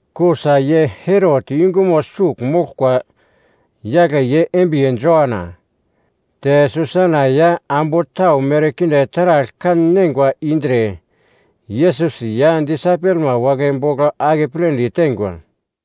Kusa ye Herot yungumo sugl moglkwa yagle ye embiye Joana. Te Susana ya ambu tau merkinde taragl kan-neingwa indre Yesus ya disaipelma wagle bogl akepledi teingwa.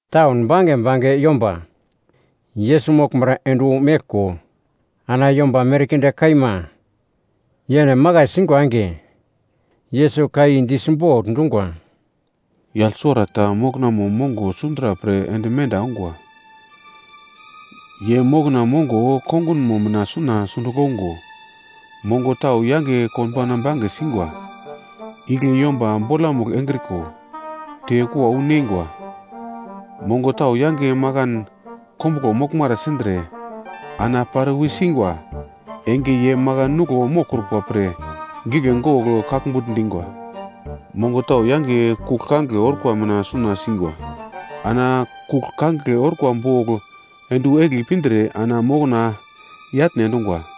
Taun bange bange yomba, Yesus moglmara ende wu meglko, ana yomba merkinde kaima yene makai singwa enge, Yesus ka i di simbogl dungwa, “Yagl suwarata moknamo mongo sundra pre ende menda ongwa. Ye mokna mongo kongunmo mina suna sundugl ongo, mongo tau yange konbauna bange singwa, igle yomba bolamugl engriko, te kua wu neingwa. Mongo tau yange makan kombuglo moglmara sindre ana pare wi singwa enge ye makan nuglo moglkrukwa pre gigle gogl kaglmbugl dingwa. Mongo tau yange kugl kangigle orkwa mina suna singwa. Ana kugl kangigle orkwa bogl ende wu egli pindre ana mokna yatne endungwa.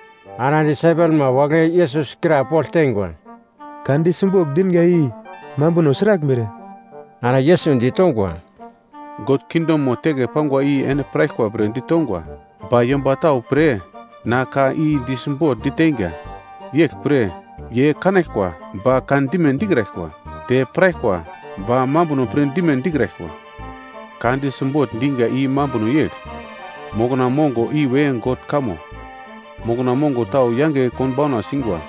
Ana disaipelma wagle Yesus krapogl teingwa, “Ka di simbogl dinga i mambuno sraglmere.” Ana Yesus ditongwa, “God kingdomo teke pangwa i ene piraglkwa pre ditongwa, ba yomba tau pre na ka i di simbogl diteinga, yegl pre, “‘ye kanaglkwa, ba kan dime dikraglkwa, te piraglkwa, ba mambuno pir dime dikraglkwa.’ “Ka di simbogl diga i mambuno yegl, mokna mongo iwe God kamo. Mokna mongo tau yange konbauna singwa,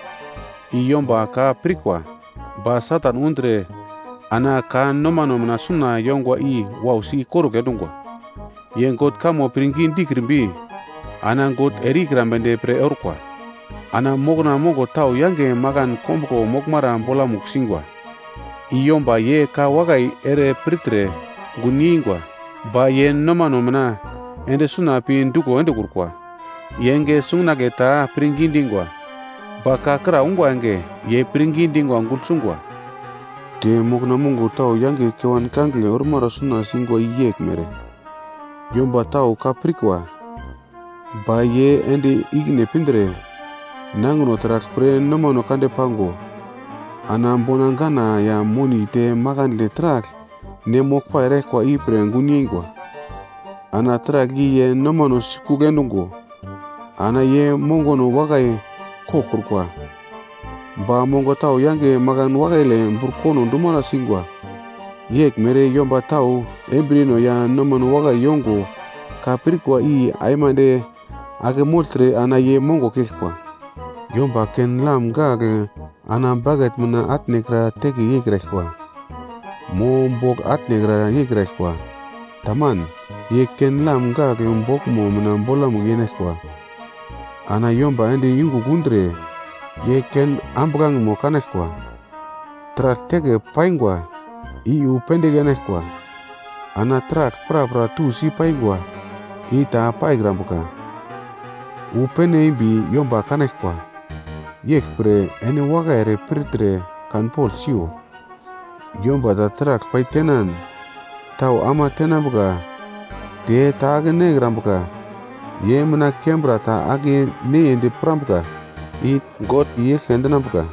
i yomba ka pirkwa. Ba Satan undre ana ka nomano mina suna yongwa i wausi ikorugl endungwa. Ye God kamo pirngi dikrimbi ana God ere-ikrambedi pre orkwa. Ana mokna mongo tau yange makan kombuglo moglmara bolamugl singwa i yomba ye ka wakai ere pirtre gunyei ingwa. Ba ye nomano mina ende suna pi duglo endekrukwa. Ye enge sungunagle ta pirngi dingwa, ba ka kra ungwa enge ye pirngi dingwa gugl sungwa. Te mokna mongo tau yange kewan kangigle ormara suna singwa i yeglmere, yomba tau ka pirkwa, ba ye ende ikine pindre, nangino taragl pre nomano kande pango, ana bona gana ya moni te makandle taragl ne moglpai eraglkwa ipre gun yengwa. Ana taragl i ye nomano sikugl endungo, ana ye mongono wakai koglkrukwa. Ba mongo tau yange makan wakaile burkono dumara singwa, yeglmere yomba tau embriyeno ya nomano wakai yongo ka pirkwa i aimande ake mogltre ana ye mongo keglkwa. “Yomba ken-lam gagl ana baket mina atnekra teke yeikraglkwa, mo bogl atnekra yeikraglkwa. Taman, ye ken-lam gagl boglmo mina bolamugl yenaglkwa, ana yomba ende yungugl undre ye ken ambuglangemo kanaglkwa. Taragl teke paingwa i wu pendigl enaglkwa. Ana taragl prapra tusi paingwa i ta paikrambuka, wu pene embi yomba kanaglkwa. Yeglpre ene wakai ere pirtre kanpogl siyo, yomba ta taragl pai tenan tau ama tenambuka te ta ake-nekrambuka ye mina kembra ta ake-neyeindi pirambuka i God i-eglke endinambuka.”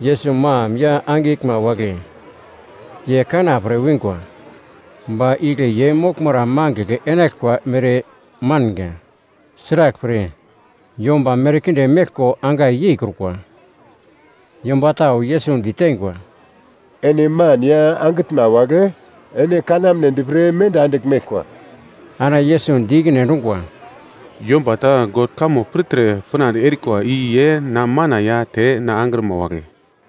Yesus mam ya angiglma wagle ye kana pre wingwa, ba igle ye moglmara mangigl enaglkwa mere manga, sraglpre yomba merkinde meglko angai yeikrukwa. Yomba tau Yesus diteingwa, “Ene man ya angitnma wagle ene kanamnedi pre menda andigl meglkwa.” Ana Yesus di ikine endungwa, “Yomba ta God kamo pirtre pinande erikwa i ye na mana ya te na angrima wagle.”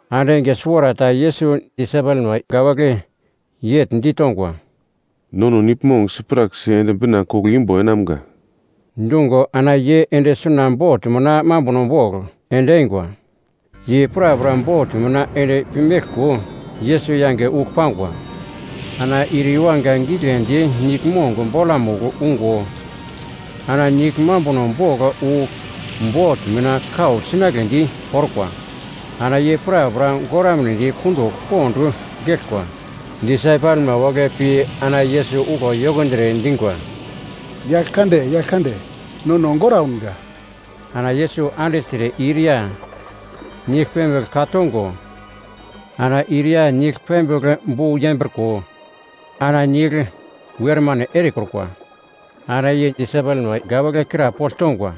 Ande enge suwarata ta Yesus disaipelma wagle yegl ditongwa, “Nono niglmong sipraksi ende bina koglo imbo enamga.” Dungo ana ye ende suna bot mina mambuno bogl ende eingwa. Ye prapra bot mina ende pi meglko, Yesus yange ugl pangwa. Ana ir yuwanga giglendi niglmong bolamugl ungo, ana nigl mambuno bogl wu bot mina kau sinagledi orkwa. Ana ye prapra goramnedi kundugl pond geglkwa. Disaipelma wagle pi ana Yesus uglo yokondre dingwa, “Yaglkande, Yaglkande, nono goraunga!” Ana Yesus andigltre ir ya nigl pembigl ka tongo, ana ir ya nigl pembigl bu yembriko ana nigl wermane erekrukwa. Ana ye disaipelma wagle krapogl tongwa,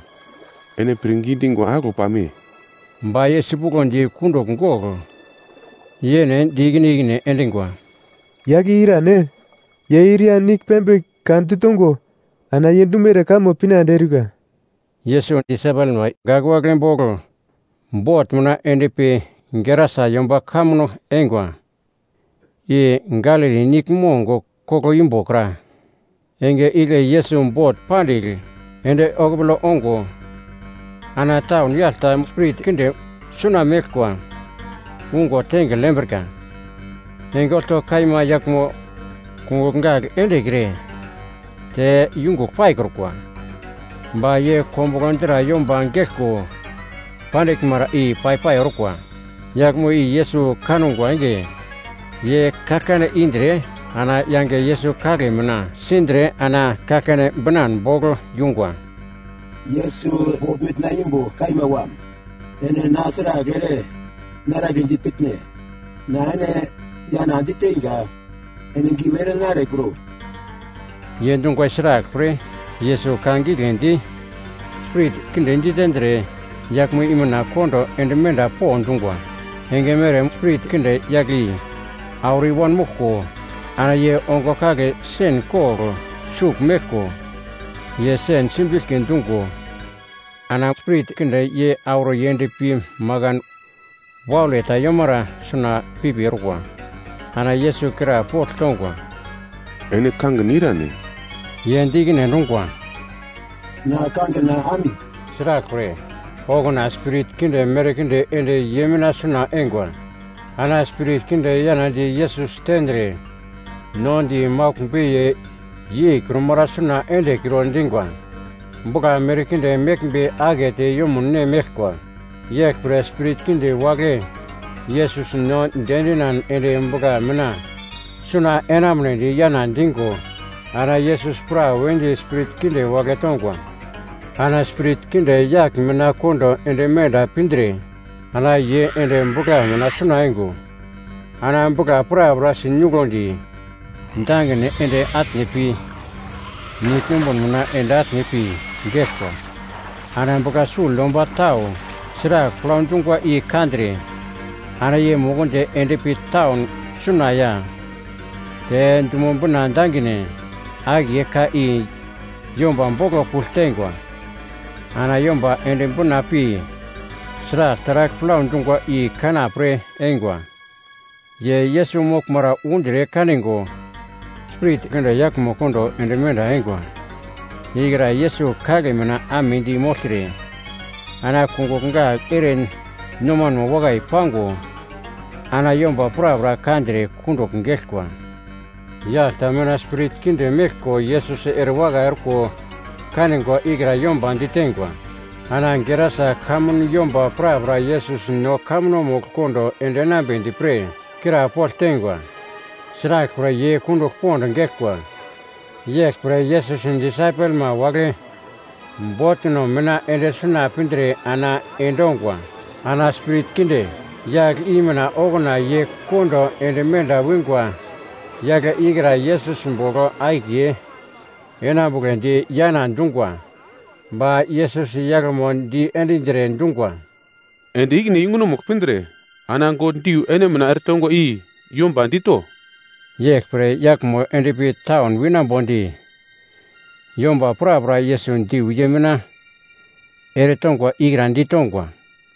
“Ene pirngi dingwa aglo pame?” Ba ye sipuglodi kundugl gogl, ye yene di ikine ikine endingwa, “Yagl i irane? Ye ir ya nigl pembigl ka ditongo ana ye dumere kamo pinande eurika.” Yesus disaipelma wagle bogl bot mina ende pi Gerasa yomba kamuno eingwa, i Galili niglmong koglo imbo kra. Enge igle Yesus bot pandigl ende okupole ongo ana taun yagl ta spirit kinde suna meglkwa ungo tengigl yembrika. Enge olto kaima yaglmo kungugl gagl endekre te yungugl paikrukwa, ba ye kombuglo dra yomba geglko pandiglmara i pai-pai orkwa. Yaglmo i Yesus kangwa enge, ye kaglkane indre ana yange Yesus kagle mina sindre ana kaglkane binan bogl yungwa, “Yesus God mitna imbo kaima Wam, ene na sragl ere naraglendi pitne? Na ene yana diteinga, ene giu ere narekro!” Ye dungwa i sraglpre, Yesus ka giglendi spirit kinde ditendre yaglmo i mina kondo ende menda po dungwa. Enge mere spirit kinde yagle i auro i wanmoglko, ana ye ongo kagle sen kogl sugl meglko, ye sen simbiglki dungo ana spirit kinde ye auro yendpi makan waule ta yomara suna pipi orkwa. Ana Yesus krapogl tongwa, “Ene kangin irane?” Ye di ikine endungwa, “Na kangina Ami.” Sraglpre, okuna spirit kinde merkinde ende ye mina suna eingwa. Ana spirit kinde yanadi Yesus tendre, no di maugl beiye yeikrumara suna endekro dingwa. Bugla merkinde meglmbe akete yumun ne meglkwa. Yeglpre spirit kinde wagle Yesus no diendinan ende bugla mina suna enamunedi yana digo ana Yesus prawedi spirit kinde wagle tongwa. Ana spirit kinde yagl mina kondo ende menda pindre, ana ye ende bugla mina suna eingo ana bugla prapra sinoglundi dangine ende atne pi nigl numbun mina ende atne pi, geglkwa. Ana bugla sugl yomba tau sragl plau dungwa i kandre, ana ye mukundi endpi taun suna ya te dumo bina dangine akiye ka i yomba boglo kugl teingwa. Ana yomba ende bina pi sragl taragl plau dungwa i kana pre eingwa. Ye Yesus moglmara undre kanigo, spirit kinde yaglmo kondo ende menda eingwa ikra Yesus kagle mina amedi mogltre, ana kungugl gagl ere nomanmo wakai pango ana yomba prapra kandre kundugl geglkwa. Yagl ta mina spirit kinde meglko Yesus erewakai orko kanigwa ikra yomba diteingwa. Ana Gerasa kamun yomba prapra Yesus no kamunomugl kondo ende enambedi pre krapogl teingwa, sraglpre ye kundugl pond geglkwa. Yeglpre Yesus disaipelma wagle botno mina ende suna pindre ana endongwa. Ana spirit kinde yagl i mina okuna ye kondo ende menda wingwa yagle ikra Yesus bogl akiye enambugledi yana dungwa. Ba Yesus yaglmo diendindire, dungwa, “Ende ikine yungunomugl pindre ana God diu ene mina eretongwa i yomba dito.” Yeglpre yaglmo endpi taun winambodi yomba prapra Yesus diu ye mina eretongwa ikra ditongwa.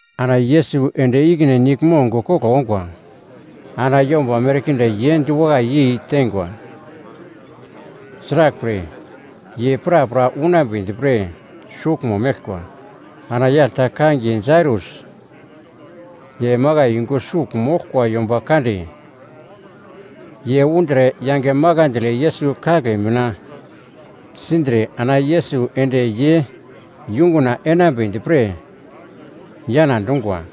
Ana Yesus ende ikine niglmong koglo ongwa. Ana yomba merkinde ye diwakai yeitengwa. Sraglpre ye prapra unambedi pre suglmo meglkwa. Ana yagl ta kangiye Jairus ye makai yungu sugl moglkwa yomba kande, ye undre yange makandle Yesus kagle mina sindre ana Yesus ende ye yunguna enambedi pre yana dungwa.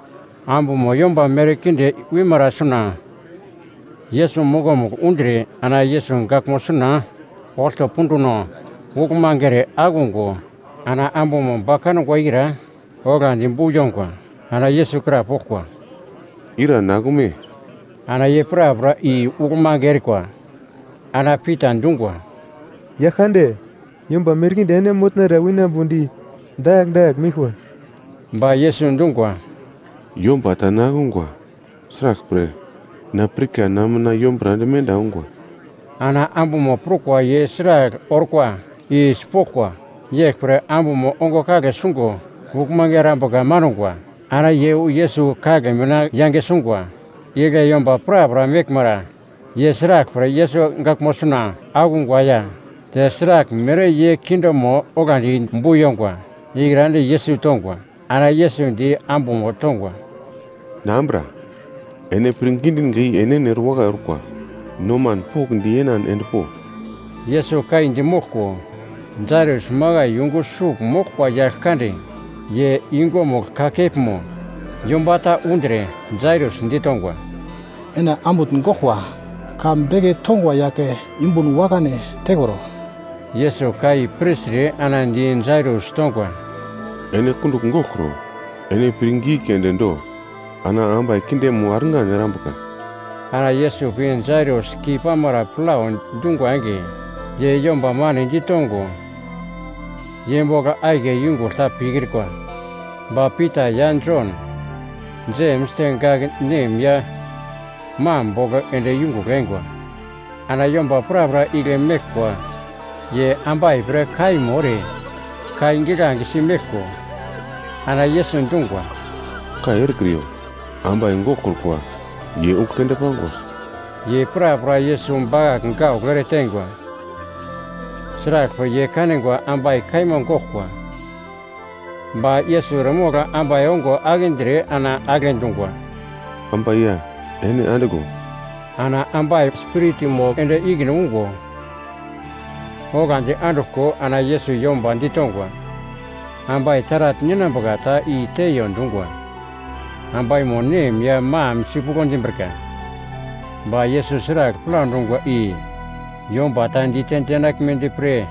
Ambumo yomba merkinde wimara suna Yesus mokomugl undre ana Yesus gaglmo suna olto punduno uglmange ere akungo ana ambumo ba kangwa ikra oglandi bu yongwa. Ana Yesus krapoglkwa, “Ira na akume?” Ana ye prapra i uglmange erikwa ana Pita dungwa, “Yaglkande, yomba merkinde ene motnara winambo di dakagl dakagl meglkwa.” Ba Yesus dungwa, “Yomba ta na akungwa. Sraglpre, na pirka na mina yombura ende menda ongwa.” Ana ambumo prukwa ye sragl orkwa i sipoglkwa, yeglpre ambumo ongo kagle sungo uglmange erambuka mangwa, ana ye wu Yesus kagle mina yange sungwa. Igle yomba prapra meglmara, ye sraglpre Yesus gaglmo suna akungwa ya te sraglmere ye kindemo oglandi bu yongwa ikra di Yesus tongwa. Ana Yesus di ambumo tongwa, “Na ambura, ene pirngi dinga i enene erewakai orkwa, noman pokndi yenan endpo.” Yesus ka i di moglko, Jairus makai yungu sugl moglkwa yagl kande ye yungumugl kakepmo yomba ta undre, Jairus ditongwa, “Ene ambutn goglkwa, ka beke tongwa yagle yumbun wakane tekro.” Yesus ka i pirtre ana di Jairus tongwa, “Ene kundugl goglkro, ene pirngi keunde do ana ambai kindemo argan erambuka.” Ana Yesus pi Jairus keipamara plau dungwa enge, ye yomba mane ditongo ye bogl akiye yungugl ta pikrikwa, ba Pita ya Jon, Jems te gak nem ya mam bogl ende yungugl eingwa. Ana yomba prapra igle meglkwa ye ambai pre kaimo ere kai giglange si meglko, ana Yesus dungwa, “Kai erekriyo, ambai goglkrukwa ye ugl keunde pangwa.” Ye prapra Yesus bakagl gaugl ereteingwa sraglpre ye kanigwa ambai kaima goglkwa. Ba Yesus eremogl ambai ongo akindre ana agle dungwa, “Ambai ya, ene andiglo.” Ana ambai spiritmo ende ikine ungo, oglandi anduglko ana Yesus yomba ditongwa, ambai taragl ninambuka ta i teiyo dungwa. Ambaimo nem ya mam sipuglo dimbrika, ba Yesus sragl plau dungwa i yomba ta dite dinaglmedi pre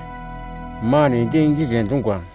manedi gigle dungwa.